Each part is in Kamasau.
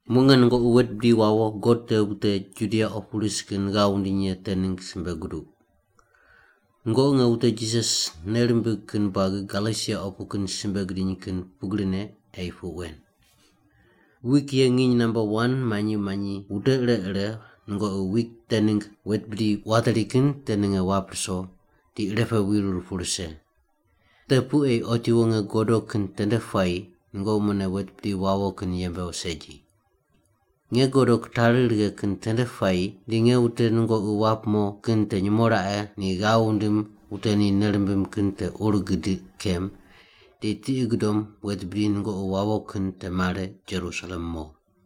Muq nge nungoqi wet bidi wawo God te wute Judia opu ris kin ghav wundiny ye te ningg simbe guduq. Nungoqi nge wute Jisas nei rimbig kin buagi Galesia opu kin simbe gidiny kin pugrine ei puq wen. Wik ye nginy namba wan manyi manyi wute ire ire nungoqi wik te ningg wet bidi wateri kin te ninge wap ruso di irepe wirur pu rise. Te pu ei otiwo nge godo kin tende puayi nungoqi mune wet bidi wawo kin yembe segi. Nge godo kitari righe kin tende puayi di nge wute nungoqi wap mo kin te nyumo raqe ni ghav wundim wute ni nei rimbim kin te ur gidiq kem di tiqi gudom wet bidi nungoqi wawo kin te mare Jerusalem mo.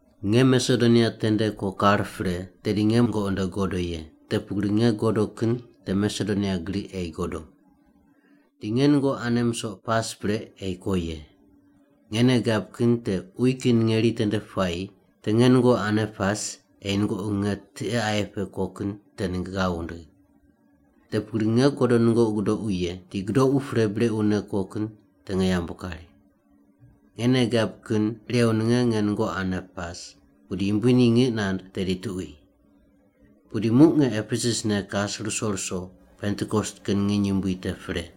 Nge Masedonia tende ko kar pre tedi nge nungoqi nde godo ye, te pugri nge godo kin te Masedonia gri ei godo. Di nge nungoqi ane musoq pas pre ei ko ye. Nge nei gab kin te uyi kin ngeri tende puayi te nge nungoqi ane pas ei nungoqi nge tiqe aye pe ko kin te ningg ghav wundigh. Te pugri nge godo nungoqi gudoqu ye, di gudoqu pre brequne ko kin te nge yambu kari. Nge nei gab kin irew ninge nge nungoqi ane pas, pudi Yumbui ni ngiq nand tedi tuqui. Pudi muq nge Epesus ne kas ruso ruso Pentikos kin nginy yumbui te pre.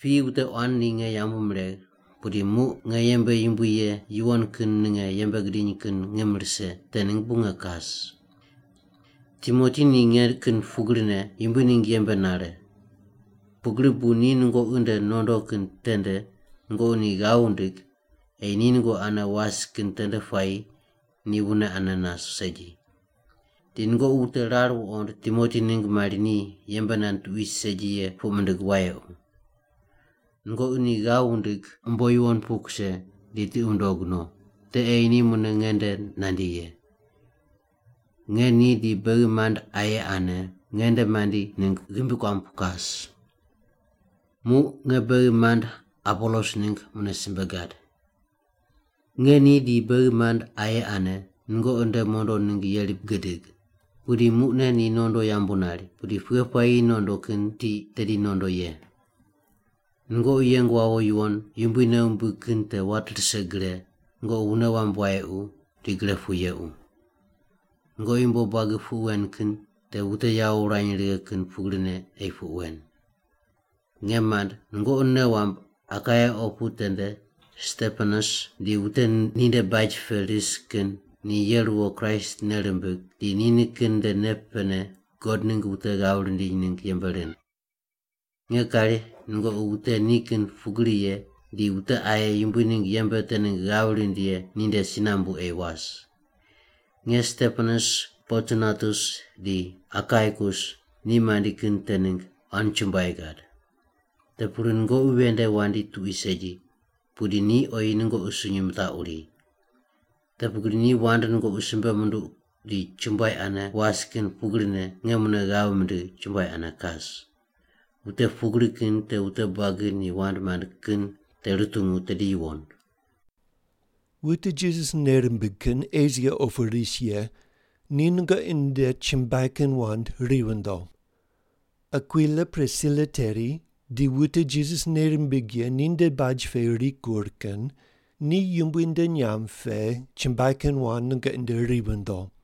Piyi wute quan ni nge yambu miregh pudi muq nge yembe yumbui ye yuwon kin ninge yembe gidiny kin ngim rise te ningg bu nge kas. Timoti ni nge kin pugrine Yumbui ningg yembe nare. Pugri bu ni nungoqi nde nondo kin tende nungoqi ni ghav wundig ei ni nungoqi ane was kin tende puayi ni wune ane nas segi. Di nungoqi wute rar wuqond Timoti ningg mari ni yembe nand tuqui segi ye puq mindig wayequ. Nungoqi ni ghav wundig umbo yuwon pu kuse di tiqi wundog no, te ei ni mune nge nde nandi ye. Nge ni di beghi mand aye ane nge nde mandi ningg ghimbi kuam pu kas. Muq nge beghi mand Apolos ningg mune simbe gad. Nge ni di beghi mand aye ane nungoqi nde mondo ningg yeri gidig. Pudi muqne ni nondo yambu nari, pudi pughe puayi nondo kin tiq tedi nondo ye. Nungoqi yeng wawo yuwon, Yumbui nei wumbig kin te wat rise gre, nungoqi wune wamb wayequ, di gre pu yequ. Nungoqi yumbo buagi puq wen kin te wute yawo wurany righe kin pugrine ei puq wen. Nge mand, nungoqi nei wamb Akaia opu tende Stepanas di wute ninde baj pe ris kin ni ye ruwo Kraist nei rimbig di ni nikin nde nei pene God ningg wute ghav rindiny ningg yembe rind. Nge kari nungoqi wute ni kin pugri ye di wute aye Yumbui ningg yembe te ningg ghav rind ye ninde si nambu ei was. Nge Stepanas, Portunatus di Akaikus ni mandi kin te ningg quan chumbuai gad. Te pugri nungoqi ven nde wandi tuqui segi pudi ni oyi nungoqi sunyi mitaquri. Te pugri ni wand nungoqi simbe munduq di chumbuai ane was kin pugrine nge mune ghav mindigh chumbuai ane kas. Wute pugri kin te wute buagi ni wand mand kin te rutungu tedi yuwon. Wute Jisas nei rimbig kin Esia opu ris ye ni nungoqi nde chumbuai kin wand ri vindo. Akwila Prisila teri di wute Jisas nei rimbig ye ninde baj pe rikur kin ni Yumbui nde nyamb pe chumbuai kin wand nungoqi nde ri vindo.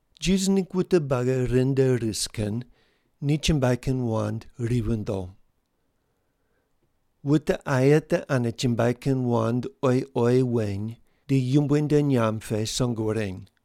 Jisas ningg wute buagi ren nde ris kin ni chumbuai kin wand ri vindo. Wute aye te ane chumbuai kin wand oyi oyi weny di Yumbui nde nyamb pe song wureny.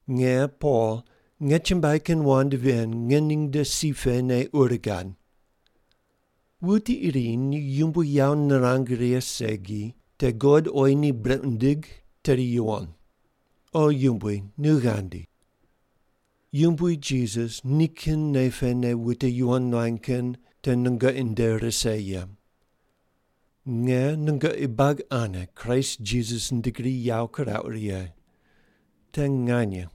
Nge Pol nge chumbuai kin wand ven ngening nde si pene ur gad. Wuti iri ni Yumbui yawo nirang righe segi te God oyi ni brequ nindig tedi yuwon. O Yumbui nu ghandi. Yumbui Jisas nikin nei pene wute yuwon nuany kin te nungoqi nde rise ye. Nge nungoqi buagi ane Kraist Jisas nde gri yawo kirauq righe. Te nganye.